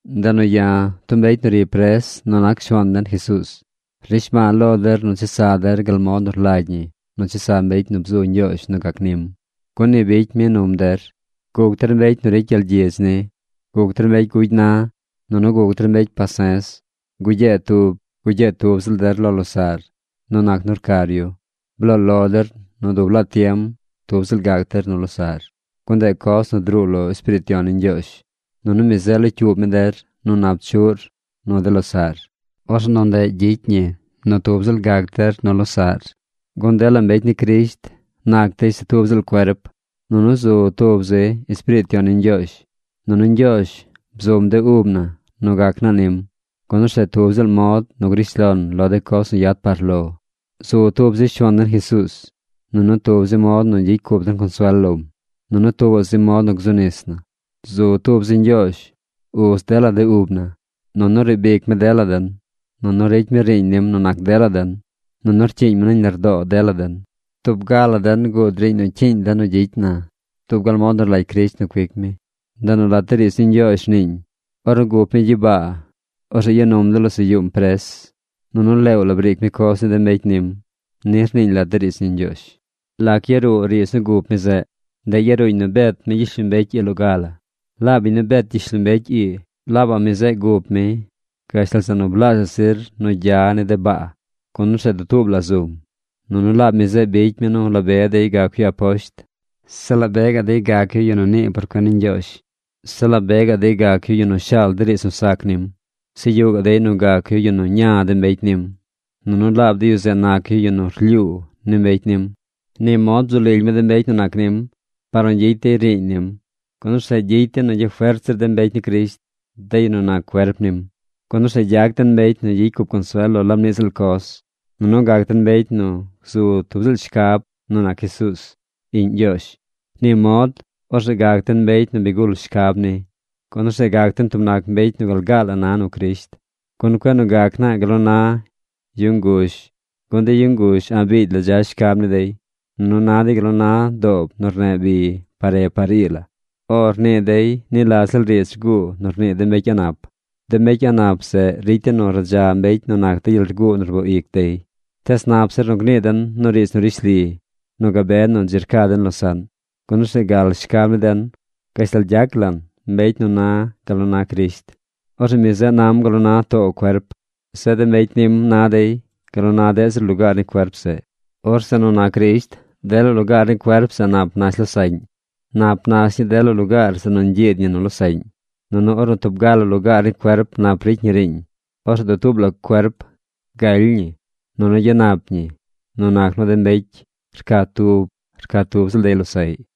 Ndeꞌ nu ya̱, tub mbecy nu ri pres nu nac Shuaan den Jesuuz, rnishba̱a̱ lo der nu chesa der gal mod nu rlagy ñi nu chesa mbecy nu bzu Ñgyoozh nu gac nim, gun ni bicy mi num der. Guc der mbecy nu ricy gyel gyidz ni. Guc der mbecy gugy na. Nunu guc der mbecy pase̱z. Gugyee tub, gugyee tub ziꞌl der lo losaꞌr nu nac nu rcar yu. Bloo lo der nu dub laa tiem tub ziꞌl gac der nu losaꞌr. Gun ndeꞌ coz nu druu lo Espiriit Yon ni Ñgyoozh, nunu mi zeꞌ locyuub mi der nu nap chuꞌr nu de losaꞌr. Orzeꞌ nu ndeꞌ gyicy ñi nu tub ziꞌl nac der nu losaꞌr. Gun dela mbecy ni Crisht nac dey se tub ziꞌl cuerp. Nunu zu tub zi Espiriit Yon ni Ñgyoozh. Nunu Ñgyoozh bzum de ub na nu gac naa nim, gun orzeꞌ tub ziꞌl mod nu grish lon lo de coz nu yad par lo. Zu tub zi Shuaan den Jesuuz, nunu tub zi mod nu gyicy cup den consuel lom, nunu tuubaꞌ zi mod nu gzu nis na. Zu tub zi Ñgyoozh, Uz dela de ub na. Nunu riib ic mi dela den. Nunu ricy mi riiñ nim nu nac dela den. Nunu rcyiiñ mi nañ lardoo dela den. Tub ga la den guud riiñ nu cyiiñ den nu gyicy na dub gal mod nu rlagy Crisht nu cuic mi. Ndeꞌ nu lat de riidz ni Ñgyoozh rniiñ: Ornu gup mi gyibaa, orzeꞌ ya num de losaꞌ yuum pres. Nunu leew la briic mi coz ni de mbecy nim. Ni rniiñ lat de riidz ni Ñgyoozh. ¿Lac yaruu riidz nu gup mi zeꞌ? Ndeꞌ yaruuñ nu bet mi gyishlombecy ii loga la. Laab biñ nu bet gyishlombecy ii, laabaꞌ mi zeꞌ gup mi gashtal zeꞌ nu blaazhaꞌ zir nu gya ni de baa, gun orzeꞌ dutuub la zum. Nunu laab mi zeꞌ bicy mi nu la be dey gac yu aposht. Zeꞌ la be gaꞌ dey gac yu yu nu nii por cuen ni Ñgyoozh. Zeꞌ la be gaꞌ dey gac yu yu nu shaal de riidz nu sac nim. Zeꞌ yuꞌ gaꞌ dey nu gac yu yu nu ña de mbecy nim. Nunu laab de yu zeꞌ nac yu yu nu rlyuu ni mbecy nim. Ni mod bzu lily mi de mbecy nu nac nim, par nu gyicy dey riiñ nim, gun orzeꞌ gyicy dey nu gyafert zir de mbecy ni Crisht, de yu nu nac cuerp nim. Gun orzeꞌ gyac den mbecy nu gyicy cup consuel lo laab niꞌ ziꞌl coz, nunu gac den mbecy nu gzu tub ziꞌl shcab nu nac Jesuuz, Iꞌñ Ñgyoozh. Ni mod orzeꞌ gac den mbecy nu bi gul shcab ni. Gun orzeꞌ gac den tub nac mbecy nu gal gaa la na nu Crisht. Gun cueꞌ nu gac naa gal nu na yu nguzh, gun de yu nguzh a̱ꞌ biigy la dza shcab ni dey. Nunu na dey gal nu na doob nu rneꞌ bi par re par ii la. “O” rnii dey ni la ziꞌl riidz rguu nu rnii de mbecy a̱ꞌ nap. De mbecy a̱ꞌ nap zeꞌ ricy dey nu radza mbecy nu nac de gyel rguu nu rboo ic dey. Tees nap zir nu gnii den nu riidz nu rishli nu gabe nu dzi rca den losaꞌn, gun orzeꞌ gal shcab ni den gashtal gyac lan mbecy nu na gal nu na Crisht. Orzeꞌ mi zeꞌ nam gal nu na too cuerp. Zeꞌ de mbecy nim na dey gal nu na deꞌ zir lugaar ni cuerp zeꞌ. Orzeꞌ nu nac Crisht dela lugaar ni cuerp zeꞌ nap nash losaꞌñ. Nap nash ñii dela lugaar zeꞌ nu ñgyiid ñi nu losaꞌñ. Nunu ornu tub ga la lugaar ni cuerp nap ricy ñi riiñ, orzeꞌ dutuub la cuerp galy ñi nunu gyanap ñi nu nac nu de mbecy rca tub rca tub ziꞌl dey losaꞌy.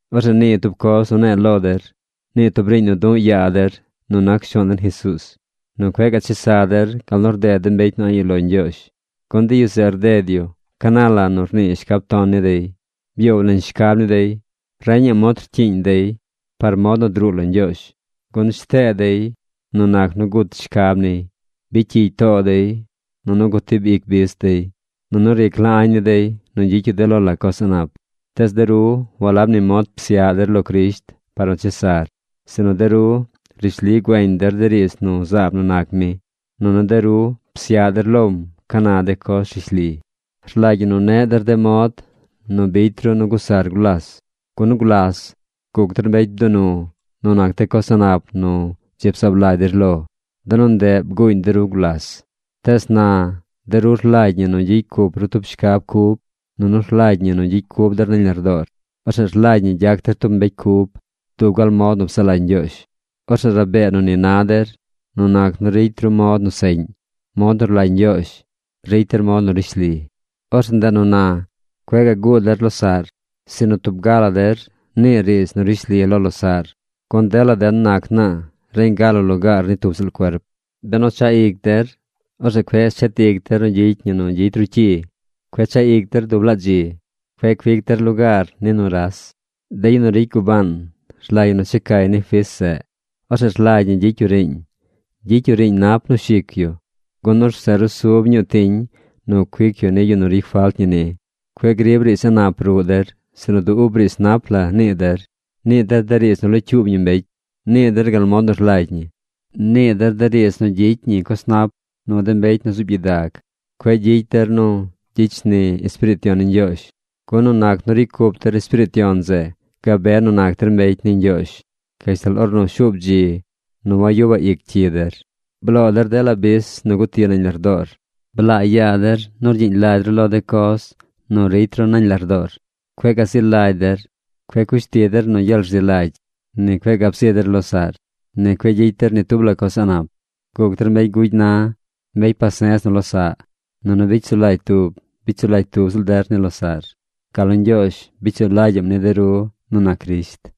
Orzeꞌ nii tub coz nu ne̱e̱ lo der. Nii tub riiñ nu du̱ꞌ yaa der nu nac Shuaan den Jesuuz: nu cueꞌ gaꞌ chesa der gal nu rded de mbecy nu a̱ꞌ yuꞌ lo Ñgyoozh. Gun de yu zeꞌ rded yu ca na la nu rnii shcab ton ni dey. Byoow nañ shcab ni dey. Reñaꞌ mod rcyiiñ dey par mod nu druu lo Ñgyoozh, gun shtee dey nu nac nu gut shcab niy. Bicy cyig too dey, nunu gutib ic bis dey. Nunu ric la añ ni dey nu gyicy yu de lo la coz a̱ꞌ nap. Tees de ru walab ni mod psyaꞌ der lo Crisht par nu chesar. Sinu de ru rishli güeñ der de riidz nu zaab nu nac mi. Nunu de ru psyaꞌ der lom ca na de coz rishli. Rlagy ñi nu neꞌ der de mod nu bicy ru nu gusar gulas. Gun gulas guc der mbecy bdunu nu nac de coz a̱ꞌ nap nu dzi bzaab lagy der lo. De nu ndeꞌ bguuñ de ru gulas. Tees na, de ru rlagy ñi nu gyicy cup ru tub shcab cub, nunu rlagy ñi nu gyicy cub der nañ lardoor. Orzeꞌ rlagy ñi gyac der tub mbecy cub, dub gal mod nu psaꞌ lagy Ñgyoozh. Orzeꞌ rabee nu ni na der nu nac nu ricy ru mod nu seꞌñ, mod nu rlagy Ñgyoozh. Ricy der mod nu rishli. Orzeꞌ ndeꞌ nu na cueꞌ gaꞌ guu der losaꞌr, sinu tub ga la der niir riidz nu rishli lo losaꞌr, gun dela den nac naa reñ ga la lugaar ni tub ziꞌl cuerp. Benu chaꞌ ic der, orzeꞌ cueꞌ shet ic der nu gyicy ñi nu gyicy ru cyi. Cueꞌ chaꞌ ic der dub laa dzi. Cueꞌ cuic der lugaar ni nuras. De yu nu ricy gubaan, rlagy ñi nu checay ni fis zeꞌ. Orzeꞌ rlagy ñi gyicy yu riiñ. Gyicy yu riiñ nap nu shic yu, gun orzeꞌ rusub ñuu tiñ nu cuic yu ni yu nu ricy falt ñi ni. Cueꞌ grib riidz a̱ꞌ nap ruꞌ der, sinu du ub riidz nap la nii der. Nii der riidz nu locyuub ñi mbecy. Nii der gal mod nu rlagy ñi. Nii der de riidz nu gyicy ñi coz nap nu de mbecy nu zuub gyidag. Cueꞌ gyicy der nu gyicy shni Espiriit Yon ni Ñgyoozh. Gun nu nac nu ricy cup der Espiriit Yon zeꞌ gabe nu nac der mbecy ni Ñgyoozh gashtal ornu shuub dzi nu wagyubaꞌ ic cyi der. Bloo der dela bis nu guti nañ lardoor. Blaa yaa der nu rgyiiñ lagy ru lo de coz nu ricy ru nañ lardoor. Cueꞌ gazi lagy der. Cueꞌ cush ti der nu gyel rzi lagy. Ni cueꞌ gab zi der losaꞌr. Ni cueꞌ gyicy der ni tub la coz a̱ꞌ nap. Guc der mbecy gugy na, mbecy pase̱z nu losaꞌ. Nunu bicy sulagy tub, bicy sulagy tub ziꞌl der ni losaꞌr, gal nu Ñgyoozh bicy sulagyaꞌm ni de ru nu nac Crisht.